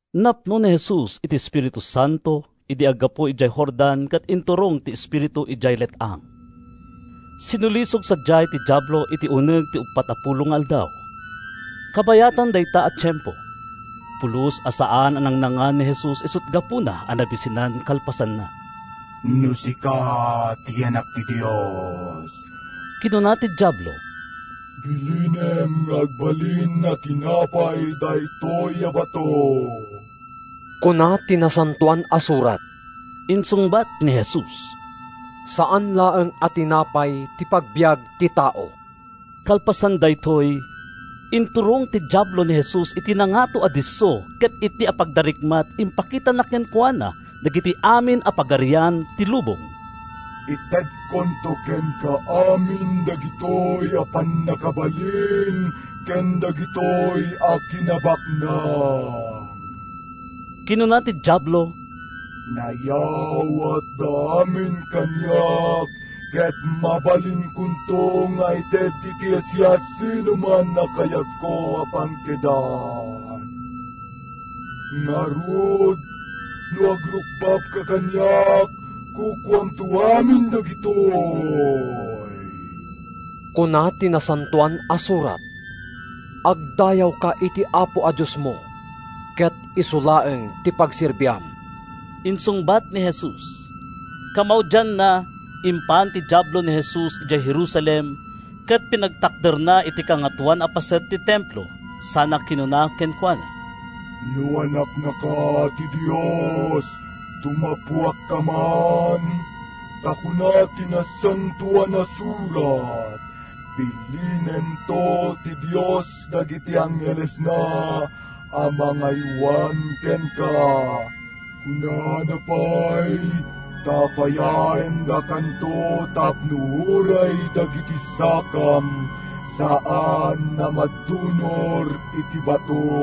Napno ni Jesus iti Espiritu Santo idi aggapu idiay Jordan ket inturong ti Espiritu idiay let-ang. Sinulisog sadiay ti Diablo iti uneg ti uppat a pulo nga aldaw. Kabayatan dayta a tiempo, pulos a saan a nangnangan ni Jesus isut’ gapuna a nabisinan kalpasanna. “No sika ti Anak ti Dios,” kinuna ti Diablo, “bilinem nga agbalin a tinapay daytoy a bato.” “Kuna ti Nasantoan a Surat,” insungbat ni Jesus, “‘Saan laeng a tinapay ti pagbiag ti tao.’” Kalpasan daytoy, inturong ti Diablo ni Jesus iti nangato a disso ket iti apagdarikmat impakitana kenkuana dagiti amin a pagarian ti lubong. “Itedkonto kenka amin dagitoy a pannakabalin ken dagitoy a kinabaknang,” kinuna ti Diablo. “Nayawatda amin kaniak ket mabalinko nga ited iti siasinoman a kayatko a pangtedan. Ngarud, no agrukbabka kaniak, kukuamto amin dagitoy.” “Kuna ti Nasantoan a Surat: ‘Agdayawka iti Apo a Diosmo ket isu laeng ti pagserbiam,’” insungbat ni Jesus. Kamaudianna, impan ti Diablo ni Jesus idiay Jerusalem ket pinagtakderna iti kangatoan a paset ti Templo sana kinuna kenkuana, “No Anaknaka ti Dios, tumapuakka man. Ta kuna ti Nasantoan a Surat: ‘Bilinento ti Dios dagiti anghelesna a mangaywan kenka.’ Kunana pay: ‘Tapayaendakanto tapno uray dagiti sakam saan a madunor iti bato.’”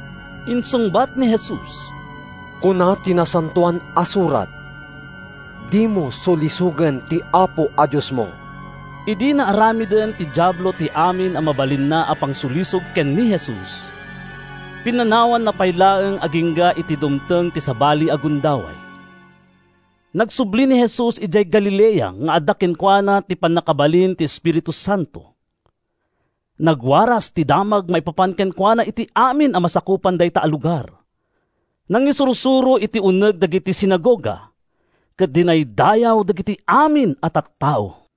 Insungbat ni Jesus, “Kuna ti Nasantoan a Surat: ‘Dimo sulisogen ti Apo a Diosmo.’” Idi naaramiden ti Diablo ti amin a mabalinna a pangsulisog ken ni Jesus, pinanawanna pay laeng agingga iti dumteng ti sabali a gundaway. Nagsubli ni Jesus idiay Galilea nga adda kenkuana ti pannakabalin ti Espiritu Santo. Nagwaras ti damag maipapan kenkuana iti amin a masakupan dayta a lugar. Nangisursuro iti uneg dagiti sinagoga, ket dinaydayaw dagiti amin a tattao.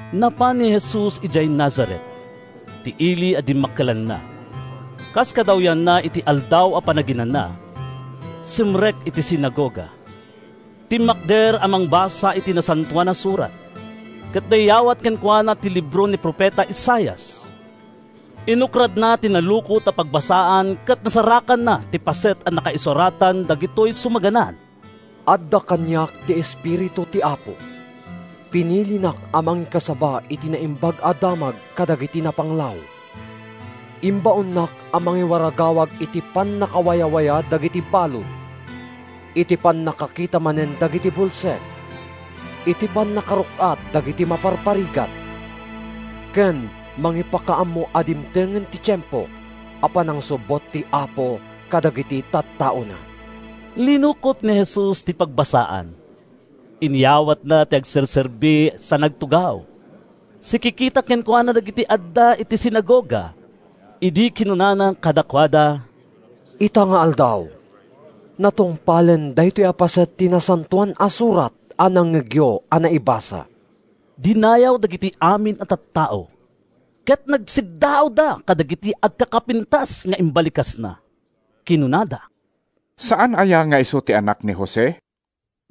Napan ni Jesus idiay Nazaret, ti ili a dimmakkelanna. Kas kadawyanna iti Aldaw a Panaginana, simrek iti sinagoga. Timmakder a mangbasa iti Nasantoan a Surat, ket nayawat kenkuana ti libro ni profeta Isaias. Inukradna ti nalukot a pagbasaan ket nasarakanna ti paset a nakaisuratan dagitoy sumaganad: “Adda kaniak ti Espiritu ti Apo. Pinilinak a mangikasaba iti Naimbag a Damag kadagiti napanglaw, Imbaonnak a mangiwaragawag iti pannakawayawaya dagiti balud, Iti pannakakita manen dagiti bulsek, Iti pannakaruk-at dagiti maparparigat, Ken mangipakaammo a dimtengen ti tiempo a panangsubbot ti Apo kadagiti tattaona.” Linukot ni Jesus ti pagbasaan, inyawatna iti agserserbi sa nagtugaw. Sikikita kenkuana dagiti adda iti sinagoga idi kinunana kadakuada, “Ita nga aldaw, natungpalen daytoy a paset ti Nasantoan a Surat a nangngegyo a naibasa.” Dinayaw dagiti amin a tattao, ket nagsiddaawda kadagiti agkakapintas nga imbalikasna. Kinunada, “Saan aya nga isu ti anak ni Jose?”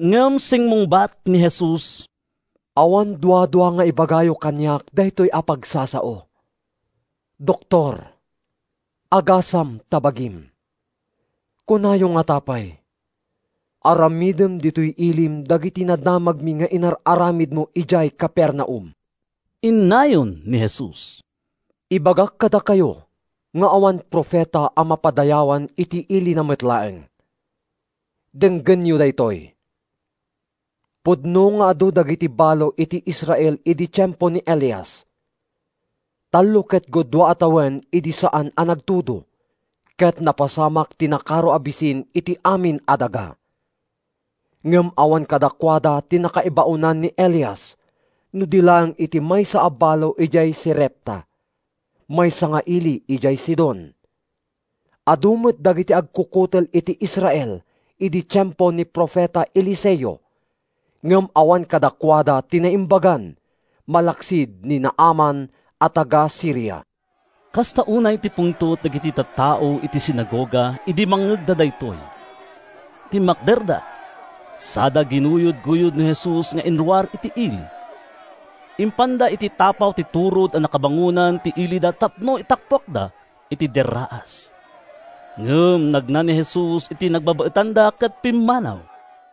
Ngem simmungbat ni Jesus, “Awan duadua nga ibagayo kaniak daytoy a pagsasao: ‘Doktor, agasam ta bagim.’ Kunayo ngata pay: ‘Aramidem ditoy ilim dagiti nadamagmi nga inar-aramidmo idiay Capernaum.’” Innayon ni Jesus, “Ibagak kadakayo nga awan profeta a mapadayawan iti ilina met laeng. Denggenyo daytoy: Pudno nga adu dagiti balo iti Israel idi tiempo ni Elias. Tallo ket gudua a tawen idi a saan a nagtudo, ket napasamak ti nakaro a bisin iti amin a daga. Ngem awan kadakuada ti nakaibaonan ni Elias no di laeng iti maysa a balo idiay Serepta, maysa nga ili idiay Sidon. Adu met dagiti agkukutel iti Israel idi tiempo ni profeta Eliseo. Ngem awan kadakuada ti naimbagan malaksid ni Naaman a taga-Siria.” Kasta unay ti pungtot dagiti tattao iti sinagoga idi mangngegda daytoy. Timmakderda, sada ginuyodguyod ni Jesus nga inruar iti ili. Impanda iti tapaw ti turod a nakabangonan ti ilida tapno itappuakda iti derraas. Ngem nagna ni Jesus iti nagbabaetanda ket pimmanaw.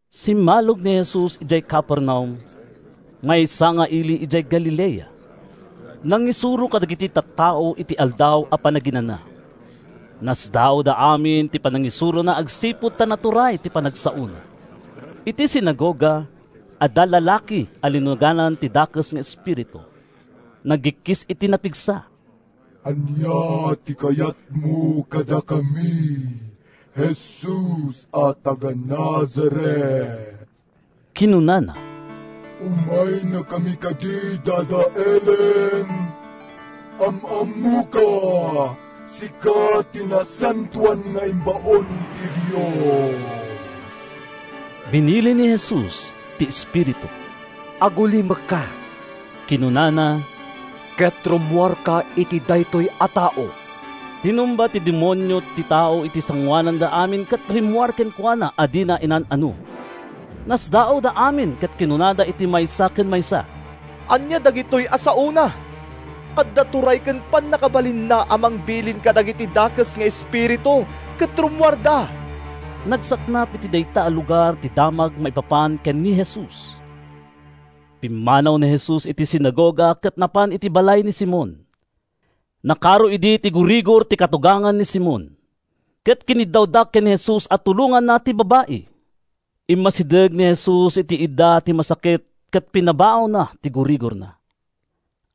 Simmalog ni Jesus idiay Capernaum, maysa nga ili idiay Galilea. Nangisuro kadagiti tattao iti Aldaw a Panaginana. Nasdaawda amin iti panangisurona agsipud ta naturay ti panagsaona. Iti sinagoga, adda lalaki a linuganan ti dakes nga espiritu. Nagikkis iti napigsa. “Ania ti kayatmo kadakami, Jesus a taga-Nazaret?” kinunana. “Umaynakami kadi dadaelen? Am-ammoka! Sika ti Nasantoan nga imbaon ti Dios.” Binilin ni Jesus ti espiritu. “Agulimekka,” kinunana, “ket rummuarka iti dayta a tao!” Tinumba ti demonio ti tao iti sangoananda amin ket rimmuar kenkuana a dina inan-ano. Nasdaawda amin ket kinunada iti maysa ken maysa: “Ania dagitoy a saona? Adda turay ken pannakabalinna a mangbilin kadagiti dakes nga espiritu, ket rummuarda!” Nagsaknap iti dayta a lugar ti damag maipapan ken ni Jesus. Pimmanaw ni Jesus iti sinagoga ket napan iti balay ni Simon. Nakaro idi ti gurigor ti katugangan ni Simon, ket kiniddawda ken ni Jesus a tulonganna ti babai. Immasideg ni Jesus iti idda ti masakit ket pinabaawna ti gurigorna.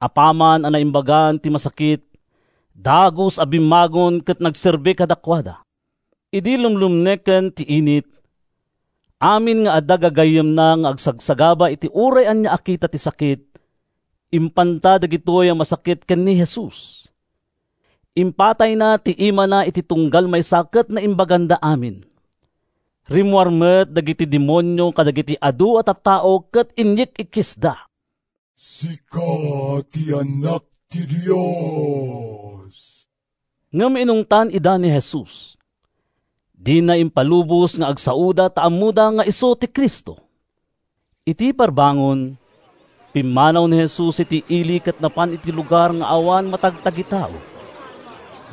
Apaman a naimbagan ti masakit, dagus a bimmangon ket nagserbi kadakuada. Idi lumlumneken ti init, amin nga adda gagayyemna nga agsagsagaba iti uray ania a kita ti sakit, impanda dagitoy a masakit ken ni Jesus. Impatayna ti imana iti tunggal maysa ket naimbaganda amin. Rimmuar met dagiti demonio kadagiti adu a tattao ket inyik-ikkisda: “Sika ti Anak ti Dios!” Ngem inungtan ida ni Jesus. Dina impalubos nga agsaoda ta ammoda nga isu ti Cristo. Iti parbangon, pimmanaw ni Jesus iti ili ket napan iti lugar nga awan matagtagitao.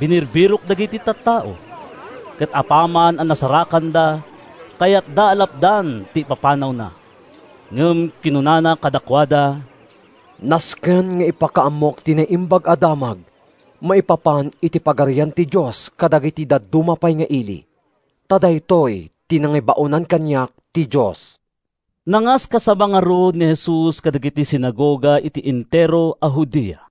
Binirbirok dagiti tattao, ket apaman a nasarakanda, kayatda a lapdan ti ipapanawna. Ngem kinunana kadakuada, “Nasken nga ipakaammok ti Naimbag a Damag maipapan iti Pagarian ti Dios kadagiti dadduma pay nga ili, ta daytoy ti nangibaonan kaniak ti Dios.” Nangaskasaba ngarud ni Jesus kadagiti sinagoga iti entero a Judea.